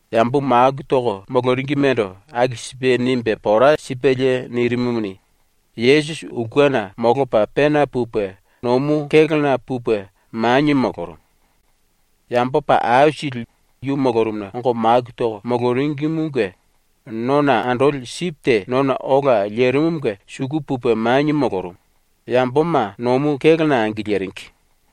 Yambo maku toko moloringimendo aku sipe nimbe pora sipelie nirimumuni, Yesusi ulkena molopa pena pupe nomu kélona pupe manie molorumu. Yambo paa aisili yu molorumuna ongo maku toko moloringimunge nona andoli sipi te nona ola lerimumunge suku pupe manie molorumu, yamboma nomu kélona angiliringi.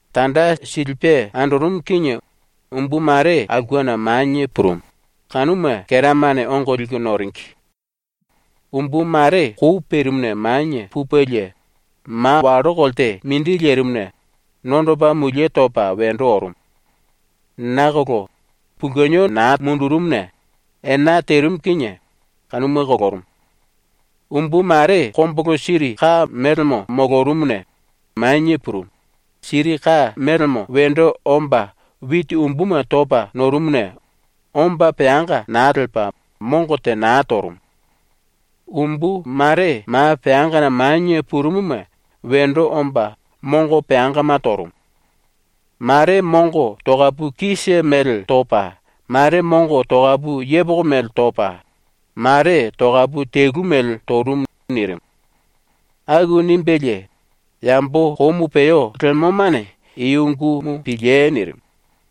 Tanda silipe andorumu kinie umbu mare aulkena manie purumu, kanuma keramane ongo liku noringi. Umbu mare kou perimuna manie pupelie ma wallo kolte mindi lerimuna nondopa mulie topa wendo orumu. Nakolo pulkeno naa mundurumuna ena terimu kinie kanuma kolorumu. Umbu mare kombulu siri ka mélemo molorumuna manie purumu, siri ka melemo wendo omba witi umbuma topa norumuna omba peanga naa lepa ⸤mongo te na torumu⸥. Umbu mare ma peangana manie purumuma wendo omba mongo peangama torumu. Mare mongo tokapu kise mele topa, mare mongo tokapu yepoko mele topa, mare tokapu telu mele torumu.” ⸤nirimu.⸥ ⸤Aku nimbelie⸥ “Yambo komu peo lemomane i ungumu piliei.” nirimu.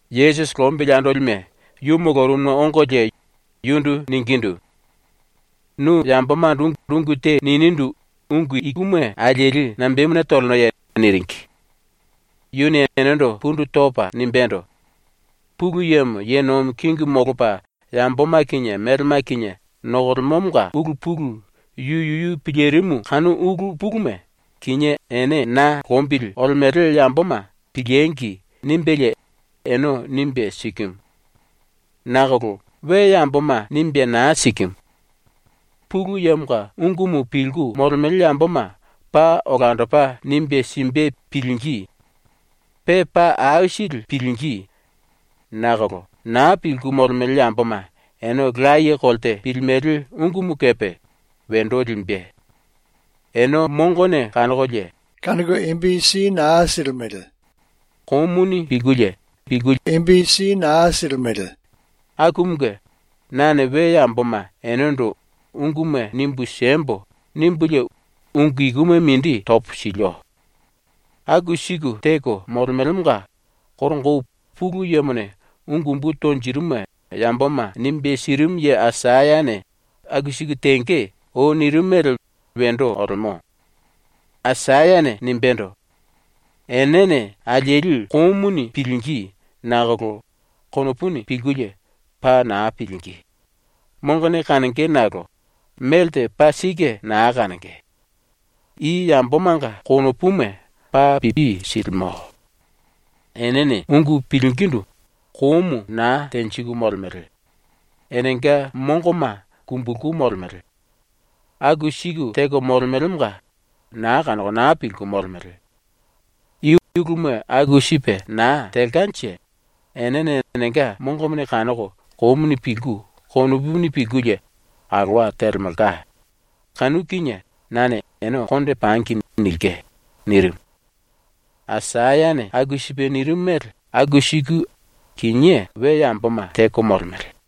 Yesusi lombili andolime yu molorumuna ongolie yundu ningindu: “Nu yambomando ungu te ninindu ungu ikuma alieli nambemuna tolenoye?” niringi. Yuni enendo pundu topa nimbendo: “Pulu Yemo ye nomi kingimu molopa yamboma kinie melema kinie nokolemomonga ulu pulu yu yuyu pilirimu kanu ulu puluma ‘Kinié ene ⸤na lombili olemele yamboma⸥ piliengi!’ nimbelie ene nimbe sikimu. Nakolo we yamboma nimbe naa sikimu. Pulu Yemonga ungumu pilku molemele yamboma paa olandopa nimbe simbe pilingí. Pe paa aisili pilingí. Nakolo naa pilku molemele yamboma ene laye kolte pilimele ungumu kepe wendo limbe. ‘Ene mongone kanokolie naa kanoko, komuni pilkulie naa pilimele.’ akumunge nane we yamboma enendo ‘Unguma nimbu siembo.’ nimbulie ungu ikuma mindi topo silio. “Aku siku teko molemelemonga koronga ou Pulu Yemone ungu umbu tonjirimuma yamboma nimbe sirimu ye Aisayane “Aku siku tenge.” ou nirimu mele wendo olemo. Aisayane nimbendo: “Enene alieli komuni pilingí nakolo konopuni pilkulie paa naa pilingí; mongone kanonge nakolo melte paa sike na kanonge. I yambomanga konopuma paa pipi silimo; enene ungu pilingindu komu na tenjiku molemele; enenga mongoma kumbulku molemele. Aku siku teko molemelemonga na kanoko na pilku molemele. I uluma aku sipe na telkanje enene enenga mongone kanoko komuni pilku konopuni pilkulie alowa telemelka, kanu kinie nane ‘Ene konde pangi.’ nilke.” nirimu. ⸤Aisayane aku sipe nirimu mele⸥ aku siku kinié we yamboma teko molemele.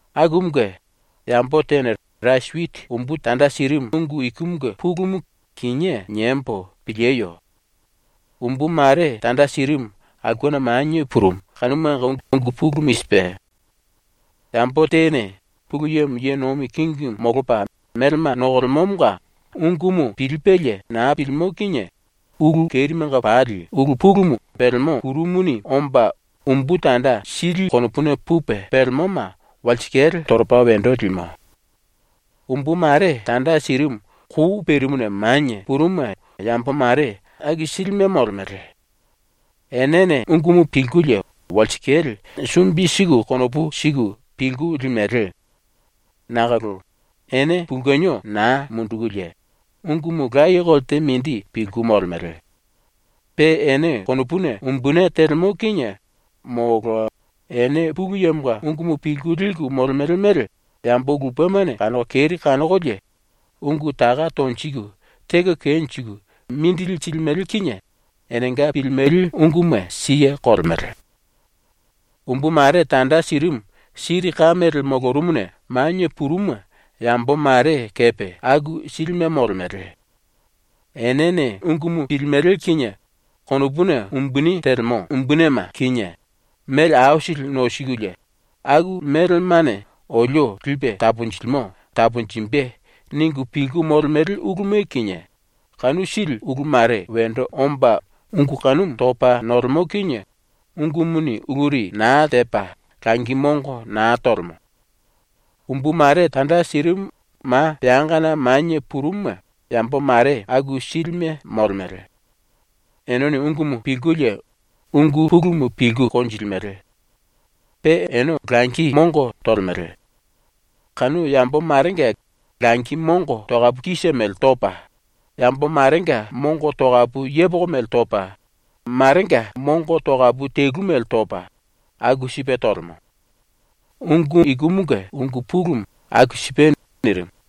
“Akumunge, yambo tene rasi witi umbu tanda sirimu ungu ikumunge pulumu kinié niembo pilieyo. ⸤Umbu mare tanda sirimu aulkena manie purumu kanumanga ungu pulumu i sipe:⸥ Yambo tene Pulu Yemo ye nomi kingimu molopa melema nokolemomonga ungumu pilipelie na pilimo kinie ulu kerimenga pali ulu pulumu pelemo ⸤kuru⸥ muni omba umbu tanda sili konopuna pupe pelemoma walsikale toropa wendo limo. Umbu mare tanda sirimu kou perimuna manie purumuma yambo mare aku silime molemele. Enene ungumu pilkulie walsikale sumbi siku konopu siku pilku limele. Nakolo ene pulkeno naa mundukulie ungumu laye kolte mindi pilku molemele. Pe ene konopuna umbuni telemo kinie molo ene Pulu Yemonga ungumu pilku liku molemele mele yambo lupemane kanoko keri kanokolie ungu taka tonjiku teko kenjiku mindili silimele kinie enenga pilimele unguma siye kolemele. Umbu mare tanda sirimu siri ka mele molorumuna manie purumuma yambo mare kepe aku silime molemele. Enene ungumu pilimele kinie konopuna umbuni telemo umbunime kinie, mele aisili nosikulie ‘Aku melemane olio lipe taponjilimo taponjimbe.’ ningu pilku molemele uluma kinie, kanu sili ulu mare wendo omba ungu kanumu topa nolemo kinie ungumuni uluri naa tepa langi mongo na tolemo. Umbu mare tanda sirimu ma peangana manie purumuma yambo mare aku silime molemele. Enene ungumu pilkulie ungu pulumu pilku konjilimele. Pe ene langi mongo tolemele. Kanu yambo marenga langi mongo tokapu kise mele topa, yambo marenga mongo tokapu yepoko mele topa, marenga mongo tokapu telu mele topa, aku sipe tolemo. Ungu ikumunge ungu pulumu aku sipe.” nirimu.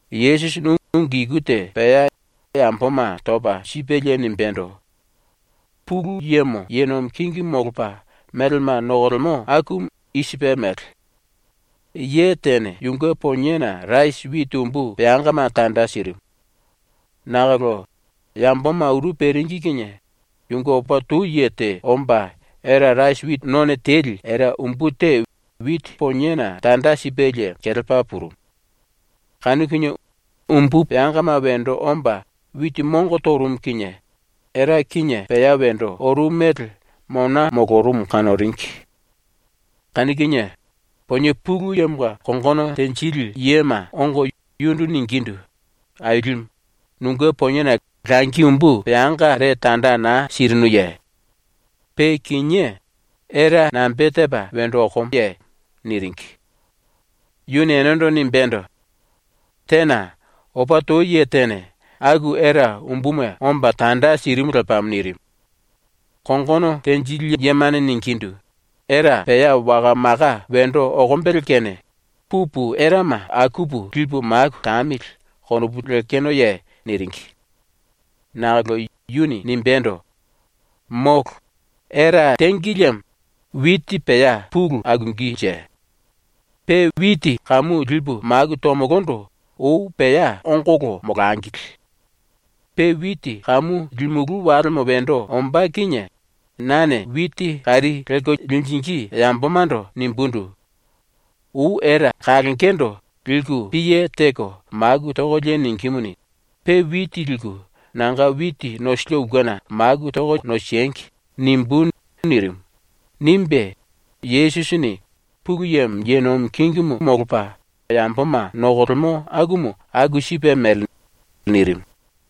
Yesusini ungu iku te pea yamboma topa sipelie nimbendo: “Pulu Yemo ye nomi kingimu molopa melema nokolemo akumu i sipe mele: Ye tene yunge poniena rasi witi umbu peangama tanda sirimu. Nakolo yamboma uru peringi kinie yunge opa tou ye te omba era ⸤rasi witi none teli era⸥ umbu te witi poniena tanda sipelie kelepa purumu. Kanu kinie umbu peangama wendo omba witi mongo torumu kinie era kinie pea wendo orumu mele mona molorumu kanoringi. Kanu kinie ponie pulu yemonga kongono tenjili yema ongo yundu ningindu: “Ailimu, nunge poniena langi umbu peangare tanda naa sirinuye? Pe kinié era nambe tepa wendo okomoye?” niringi. Yuni enendo nimbendo: “Tena. Opa tou ye tene aku era umbuma omba tanda sirimu lepamo.” nirimu. Kongono tenjili yemane ningindu: “‘Era pea waka maka wendo okombele kene pupu erama akupu lipu maku tamili.’ konopu lekenoye?” niringi. Nakolo yuni nimbendo: “Molo. Era tengi liemo witi pea pulu akungínje. Pe witi kamu lipu maku tomolondo ou pea ongolo molangili. Pe witi kamu limulú walemo wendo ombá kinie nane witi kari lelko linjingí yambomando nimbundu: “Ou era kalongendo liku piye teko maku tokolie ningímuni, pe witi liku nanga witi nosilio ulkena maku toko nosengi.” nimbú.” nirimu.” nimbe, Yesusini “Pulu Yemo ye nomi kingimu molopa yamboma nokolemo akumu aku sipe mele.” nirimu.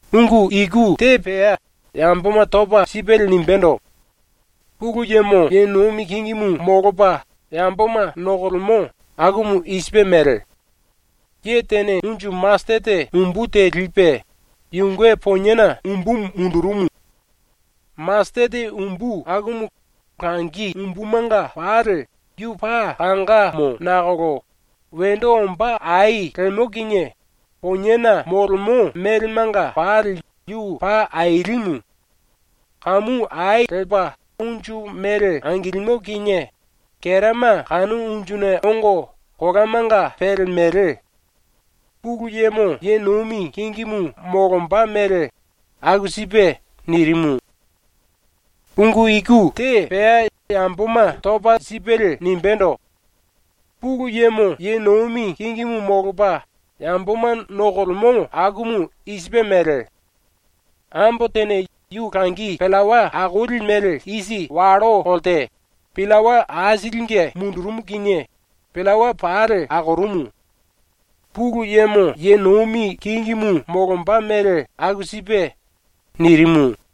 Ungu iku te pea yamboma topa sipelie nimbendo: “Pulu Yemo ye nomi kingimu molopa yamboma nokolemo akumu i sipe mele: Ye tene unju masetete umbu te lipe yunge poniena umbumu mundurumu. Masetete umbu akumu langi umbumanga pali yu paa kangamo nakolo wendo omba ai lemo kinie poniena molemo melemanga pali yu paa ailimu. Kamu ai lepa unju mele angilimo kinie kerama kanu unjuna ongo kolamanga pelemele. ⸤Pulu Yemo ye nomi kingimu molomba mele aku sipe⸥.” nirimu. Ungu iku te pea yamboma topa sipelie nimbendo: “Pulu Yemo ye nomi kingimu molopa yamboma nokolemo akumu i sipe mele: Ambo tene yu langi pillawa akoli mele isi wallo kolte pillawa aisilinge mundurumu kinie pillawa pali akorumu. ⸤Pulu Yemo ye nomi kingimu molomba mele aku sipe⸥.” nirimu.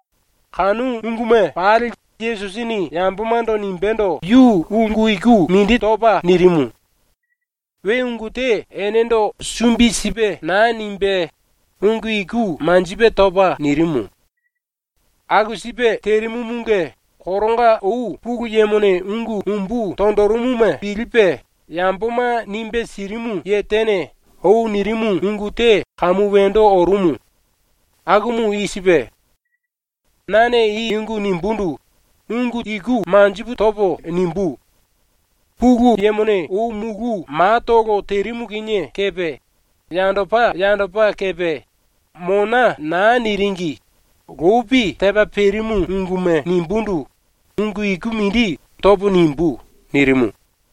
Kanu unguma pali Yesusini yambomando nimbendo yu ungu iku mindi topa nirimu. We ungu te enendo sumbi sipe naa nimbe ungu iku manjipe topa nirimu. Aku sipe terimumunge koronga ou Pulu Yemone ungu umbu tonjirimuma pilipe yamboma nimbe sirimu ye tene ou nirimu ungu te kamu wendo orumu. Akumu i sipe: “Nane i ⸤ungu nimbundu⸥ ungu iku ⸤manjipu⸥ topo nimbú. Pulu Yemone ou mulu matolo terimu kinie kepe yandopa yandopa kepe ⸤mona naa niringi⸥ lopi tepa perimu unguma ⸤nimbundu ungu iku mindi topo⸥ nimbú.” nirimu.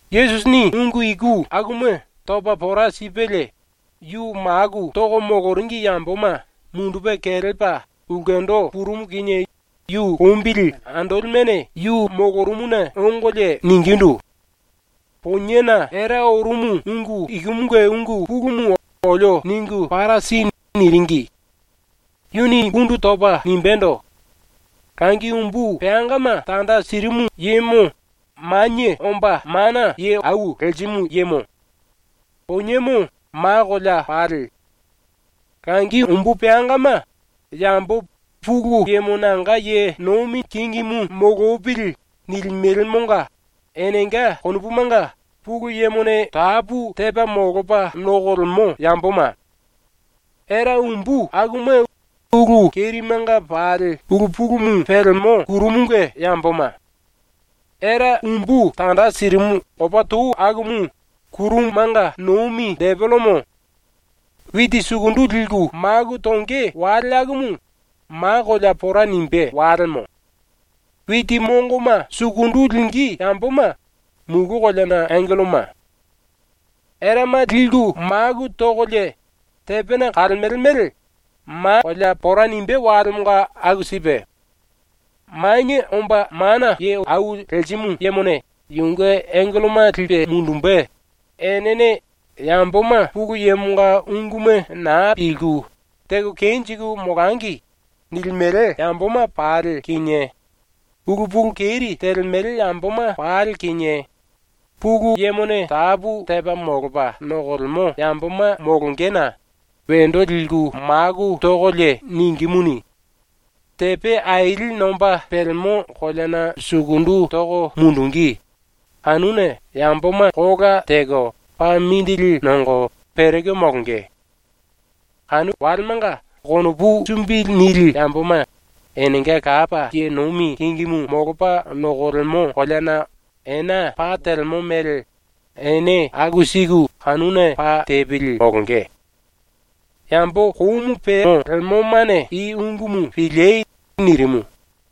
⸤Yesusini ungu iku akuma topa pora sipelie,⸥ yu maku toko moloringi yamboma mundupe kelepa ulkendo purumu kinie yu lombili andolimene yu molorumuna ongolie ningindu: “Poniena era orumu ungu ikumunge ungu pulumu olio ningu para si.” niringi. Yuni pundu topa nimbendo: “Langi umbu peangama tanda sirimu yemo Manie Omba Mana Ye Au Lerimu Yemo. Poniemo ma kolea pali. Langi umbu peangama yambo ‘Pulu Yemo nanga ye nomi kingimu molopili.’ nilimelemonga enenga konopumanga Pulu Yemone tapu tepa molopa nokolemo yamboma. Era umbu akuma ulu kerimenga pali ulu pulumu pelemo ⸤kuru⸥ munge yamboma. Era umbu tanda sirimu opa tou akumu ⸤kurumanga nomi⸥ depelemo. Witi sukundu liku maku tonge wale akumu ma kolea pora nimbé walemo. Witi mongoma sukundu lingí yamboma mulu koleana angelloma. “Erama liku maku tokolie tepena kalemele mele ma kolea pora nimbé walemonga aku sipe. Manie Omba Mana Ye Au Lerimu Yemone yunge angelloma lipe mundumbe, enene ‘Yamboma Pulu Yemonga unguma naa pilku, teko kenjiku molangi.’ nilimele yamboma pali kinie, ulu pulu keri telemele yamboma pali kinie, Pulu Yemone tapu tepa molopa nokolemo yamboma molongena wendo liku maku tokolie ningímuni, tepe aili nomba pelemo koleana sukundu toko mundungí, kanuna yamboma kola teko paa mindili nongo pereko molonge. Kanu walemanga konopu sumbi nili yamboma enenga Lapa ye nomi kingimu molopa nokolemo koleana ena pa telemo mele ene aku siku kanuna pa tepili molonge. “Yambo komu peo lemomane i ungumu piliei.” ⸤nirimu.⸥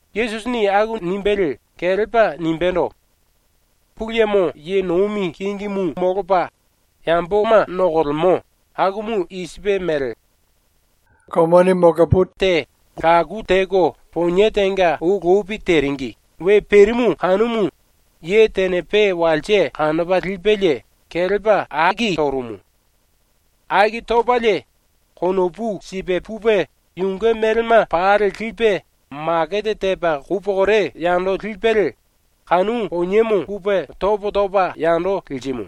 ⸤Yesusini aku nimbelie kelepa nimbendo:⸥ “Pulu Yemo ye nomi kingimu molopa yamboma nokolemo akumu i sipe mele: Sumele ombele te laku teko ponie tenga ou lopi teringi we perimu kanumu ye tene pe walse kanopa lipelie kelepa aki torumu. Aki topalie konopu sipe pupe yunge melema pali lipe makete tepa kou pokore yando lipelie kanu poniemo pupe topo topa yando lirimu.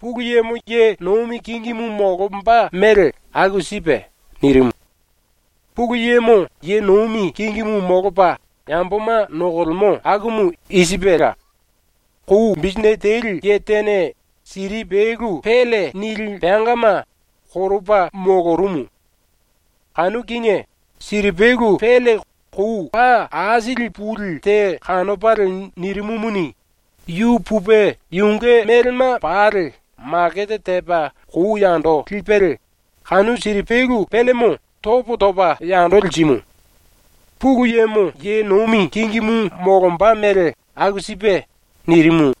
⸤Pulu Yemo ye nomi kingimu molomba mele aku sipe.⸥” ⸤nirimu.⸥ “Pulu Yemo ye nomi kingimu molopa yamboma nokolemo akumu i sipela: Kou bisinete teli ye tene siripelu ‘pélle’ nili peangama koropa molorumu. Kanu kinie siripelu pélle kou paa aisili puli te kanopalie nirimumuni, yu pupe yunge melema pali makete tepa kou yando lipelie kanu siripelu péllemo topo topa yando lirimu. ⸤Pulu Yemo ye nomi kingimu molomba mele aku sipe.⸥” ⸤nirimu.⸥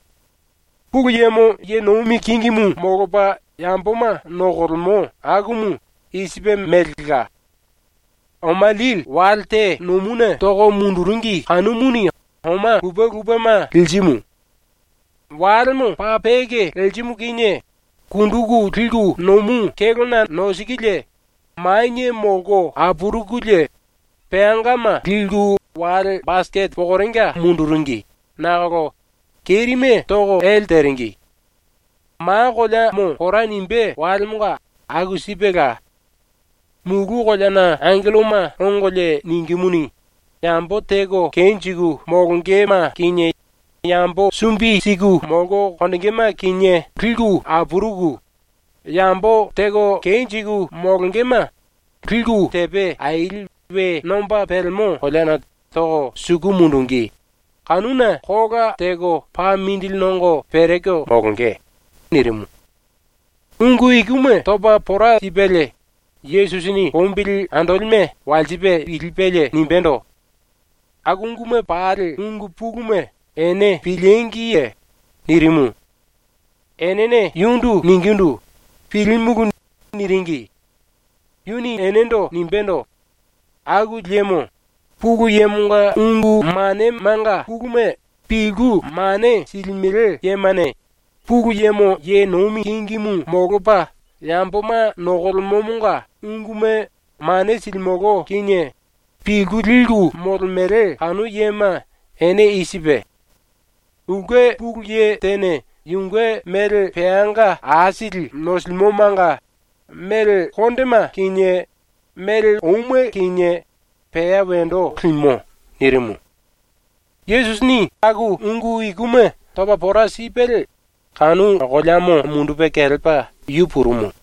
“Pulu Yemo ye nomi kingimu molopa yamboma nokolemo akumu i sipe melela: Oma lili wale te nomuna toko munduringi kanumuni oma lupe lupema lirimu. Walemo paa peke lerimu kinie kunduku liku nomu kélona nosikulie, manie molko apurukulie peangama liku wale basikete pokorenga munduringi nakolo kerime toko ele teringi. “Ma koleamo pora nimbé walemonga aku sipela. Mulu koleana angelloma ongolie ningímuni, yambo teko kenjiku molongema kinie yambo sumbi siku molko konjingíme kinie apuruku yambo teko kenjiku molongema liku tepe aili we nomba pelemo koleana toko suku mundungí, kanuna kola teko paa mindili nongo pereko molonge.” ⸤nirimu.⸥ ⸤Ungu ikuma topa pora sipelie Yesusini lombili andolime walsipe pilipelie nimbendo:⸥ “Aku unguma pali ungu puluma ene pilíngiye?” nirimu. Enene yundu ningindu: “Pilímulu.” niringi. Yuni enendo nimbendo: “Aku liemo Pulu Yemonga ungu manemanga puluma pilku mane silimele yemane Pulu Yemo ye nomi kingimu molopa yamboma nokolemomonga unguma mane silimolo kinie pilku liku molemele kanu yema ene i sipe: Ulke pulu ye tene yunge mele peanga aisili nosilimomanga mele kondema kinie mele ouma kinie pea wendo limo.” nirimu. Yesusini aku ungu ikuma topa pora sipelie kanu koleamo mundupe kelepa yu purumu.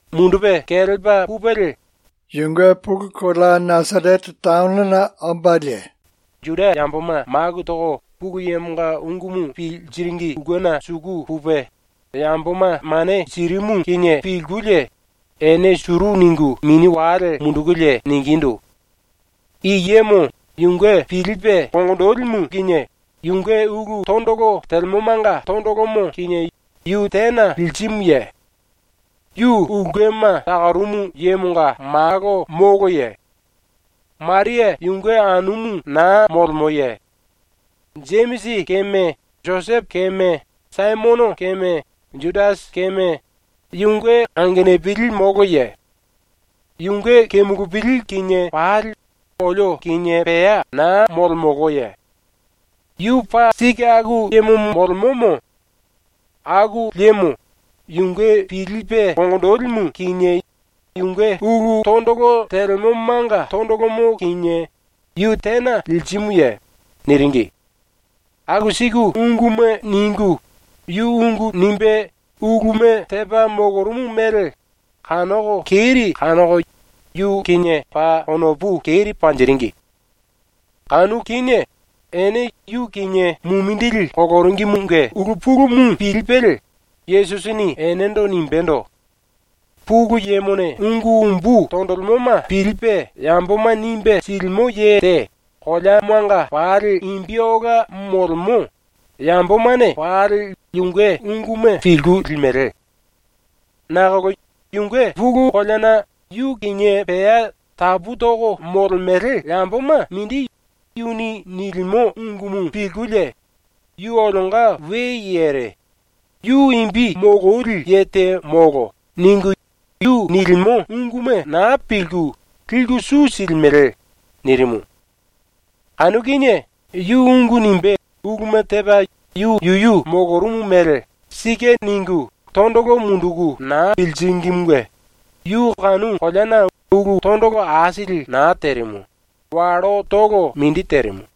Mundupe kelepa pupelie yunge pulu kolea ⸤Nasarete⸥ ombalie Juda yamboma maku toko Pulu Yemonga ungumu piliringi ulkena suku pupe yamboma mane sirimu kinie pilkulie ene suru ningu mini wale mundukulie ningindu: “I yemo yunge pilipe konginjilimu kinie yunge ulu tondolo telemomanga tondolomo kinie yu tena lirimuye? Yu ulkema takorumu yemonga malo moloye? Maria yunge anumu naa molemoye? Jemisi keme, Josepo keme, Saimono keme, Judasi keme, yunge angenupili moloye? Yunge kemulupili kinie pali olio kinie pea na molemoloye? ⸤Yu paa sike aku yemo molemomo⸥. Aku liemo yunge pilipe konginjilimu kinie yunge ulu tondolo telemomanga tondolomo kinie yu tena lirimuye?” niringi. ⸤Aku siku unguma ningu⸥ yu ungu nimbe uluma tepa molorumu mele kanoko keri kanoko yu kinie paa konopu keri panjiringi. Kanu kinie ⸤ene yu kinie mumindili koloringimunge ulu pulumu pilipelie⸥ Yesusini enendo nimbendo: “Pulu Yemone ungu umbu tonjilimoma pilipe yamboma nimbe silimo ye te koleamanga pali imbi ola molemo, yambomane pali yunge unguma pilku limele. Nakolo yunge pulu koleana yu kinie pea tapu toko molemele yamboma mindi yuni nilimo ungumu pilkulie ‘Yu olionga we yere. Yu imbi mololi ye te molo.’ ningu yu nilimo unguma naa pilku, liku su silimele.” nirimu. Kanu kinie yu ⸤ungu nimbe uluma tepa yu yuyu molorumu mele ‘Sike.’ ningu⸥ tondolo munduku naa piliringimunge yu kanu koleana ulu tondolo aisili na terimu, wallotolo mindi terimu.